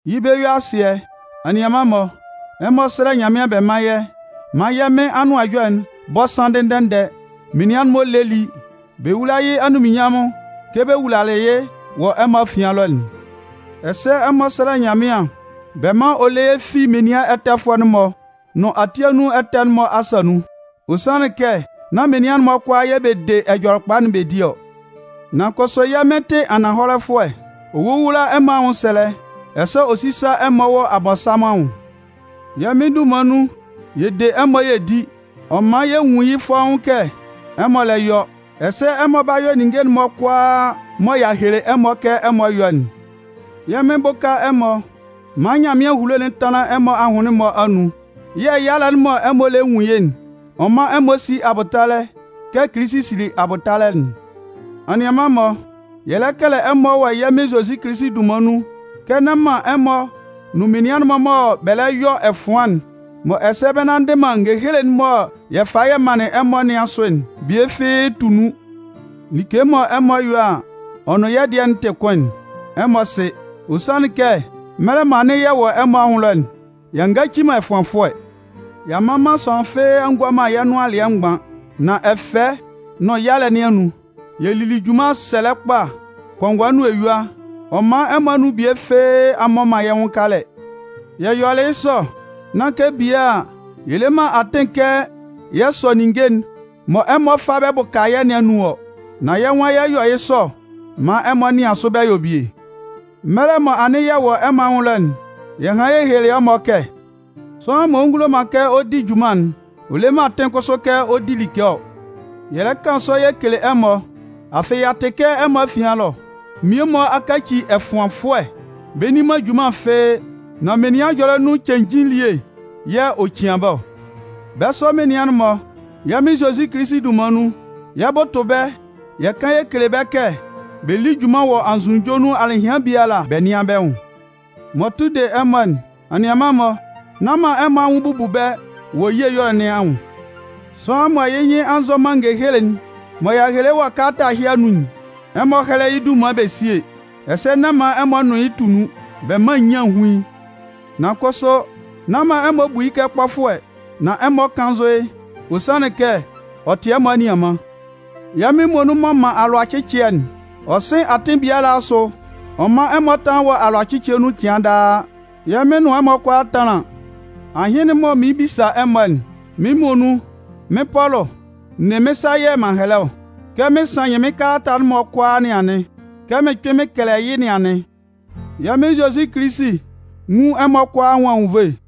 Yɩ́ bɛ-yue-asɩɛ, anianman-mɔ, ɛmɔ sɛ́lɛ Nyanmɩan bɛ mán yɛ́ maan yɛ́ Mɩn Anʋan Ɛjɔlɛ'n bɔ́ sánndɩ ndɛ-ndɛ, menian'n-mɔ lé lí, bɛ wúla yɩ́ anunminnyanmʋn kɛ bɛ wulalɩ yɩ́ wɔ ɛmɔ afian ɛlɔ'n. Ɛsɛ ɛmɔ sɛ́lɛ Nyanmɩan bɛ mán ɔ lé yɛ́ fi menian ɛtɛfʋɛ'n-mɔ nʋn ati anun ɛtɛ'n-mɔ asa nun. Ɔ sanlɩn kɛ nán menian'n-mɔ kʋalaa yɛ̂ bɛ de Ɛjɔlɛkpa'n bɛ di ɔ. Nan kʋsʋ yɛ́ Mɩn tɩ ananhɔlɛfʋɛ. Ɔ 'wowula ɛmɔ anwʋnsɛlɛ, ɛsɛ ɔ 'sisa ɛmɔ wɔ Abɔnsanmʋn anwʋn. Yɛ́ Mɩn dunman nun, yɛ de ɛmɔ yɛ di. Ɔ man yɛ nwun yɩ́ fɔ́ʋ́n kɛ ɛmɔ lɛ yɔ, ɛsɛ ɛmɔ 'ba yɔ ninnge'n-mɔ mɔ y'a hele ɛmɔ kɛ ɛmɔ yɔ́'n. Yɛ́ Mɩn bʋ́ka ɛmɔ maan Nyanmɩan ehulo'n tánlan ɛmɔ ahʋnlɩn'n-mɔ anun yɛ̂ yalɛ'n mɔ ɛmɔ lɛ nwun yɩ́'n, ɔ mán ɛmɔ sí abʋtalɛ kɛ Kilisi sili abʋtalɛ'n. Anianman-mɔ, yɛ lɛ kɛlɛ ɛmɔ wɔ yɛ́ Mɩn Zozi Kilisi dunman nun kɛ nán man ɛmɔ nʋn anianman'n-mɔ mɔ bɛ lɛ yɔ ɛfʋan'n, mɔ ɛsɛ bɛ nnanndɩ man ngehele'n mɔ yɛ falɩ yɛ manlɩn ɛmɔ nɩn asʋ'n bie fɩ́ɩ́ tu nun. Like mɔ ɛmɔ yɔ a, ɔ nʋn yɛ́ dɩɛ'n tɩ kʋn'n, ɛmɔ sɩ. Ɔ sanlɩn kɛ mɛlɛ mɔ anɩn yɛ wɔ ɛmɔ anwʋn ɛlɔ'n, y'a ngaci man ɛfʋanfʋɛ. Y'a mman man sʋanlan fɩ́ɩ́ a ngua man yɛ́ nʋan alɩɛ mgban. Nan ɛfɛ nʋn yalɛ nɩn anun, yɛ lili junman sɛlɛ kpa kɔngɔɛ nʋn eyua, ɔ man ɛmɔ anun bie fɩ́ɩ́ a mmɔ man yɛ́ nwʋn kalɛ. Yɛ yɔlɩ yɩ́ sɔ, nán kɛ bie a, yɛ le man atɩn kɛ yɛ sɔ ninnge'n mɔ ɛmɔ 'fa bɛ bʋka yɛ́ nɩn anun ɔ. Nan yɛ́ nwan yɛ 'yɔ yɩ́ sɔ maan ɛmɔ nɩan sʋ bɛ yɔ bie. Mɛlɛ mɔ anɩn yɛ wɔ ɛmɔ anwʋn ɛlɔ'n, yɛ hanlɩn yɛ helelɩ ɛmɔ kɛ: “Sʋanlan m'ɔ ngulo man kɛ ɔ di junman'n, ɔ le man atɩn kʋsʋ kɛ ɔ di like ɔ”. Yɛ lɛ kan sɔ yɛ kele ɛmɔ, afɩ y'a tɩ kɛ ɛmɔ afian ɛlɔ, mmie-mɔ a kaci ɛfʋanfʋɛ, bɛ nni man junman fɩ́ɩ́, nan menian ɛjɔlɛ nun cenjin elie yɛ̂ ɔ cian bɛ́ ɔ. Bɛ́ sɔ menian'n-mɔ, yɛ́ Mɩn Zozi Kilisi dunman nun, yɛ 'bʋtʋ bɛ́ yɛ kan yɛ kele bɛ́ kɛ bɛ lí junman wɔ anzʋnunjɔ nun alɩhɩan biala bɛ nɩ́an bɛ́ nwʋn. M'ɔ tʋ de ɛmɔ'n, anianman-mɔ, nán man ɛmɔ anwʋn bubu bɛ́ wɔ ye ɛyɔlɛ nɩn anwʋn. Sʋanlan mɔ yɩ́ nyɩn a nzɔ man ngehele'n mɔ y'a hele wɔ kalata ɛhɩ anun'n, ɛmɔ hɛ́lɛ yɩ́ dunman bɛ síe, ɛsɛ nán man ɛmɔ nʋn yɩ́ tu nun, bɛ mán nyian hún yɩ́. Nan kʋsʋ, nán man ɛmɔ bu yɩ́ kɛ kpɔfʋɛ, nan ɛmɔ kánnzʋ yɩ́. Ɔ sanlɩn kɛ ɔ tɩ ɛmɔ anianman. Yɛ́ Mɩn muonun m'ɔ man alʋacɩcɩɛ'n, ɔ sɩ́n atɩn biala asʋ ɔ mán ɛmɔ tánlan wɔ alʋacɩcɩɛ nun cɩan daa. Yɛ́ Mɩn nʋn ɛmɔ kʋalaa tánlan. Ahɩn'n mɔ mɩɩn bisa ɛmɔ'n, mɩ́n muonun, mɩ́n Pɔlʋ, n ne mɩ́n sa yɛ̂ m'an hɛlɛ ɔ. Kɛ mɩn sannyɩn mɩ́n kalata'n-mɔ kʋalaa nɩn anɩn, kɛ mɩn kpɩn mɩn kɛlɛ yɩ́ nɩn anɩn. Yɛ́ Mɩn Zozi Kilisi nwún ɛmɔ kʋalaa anwʋn anwunnvoe.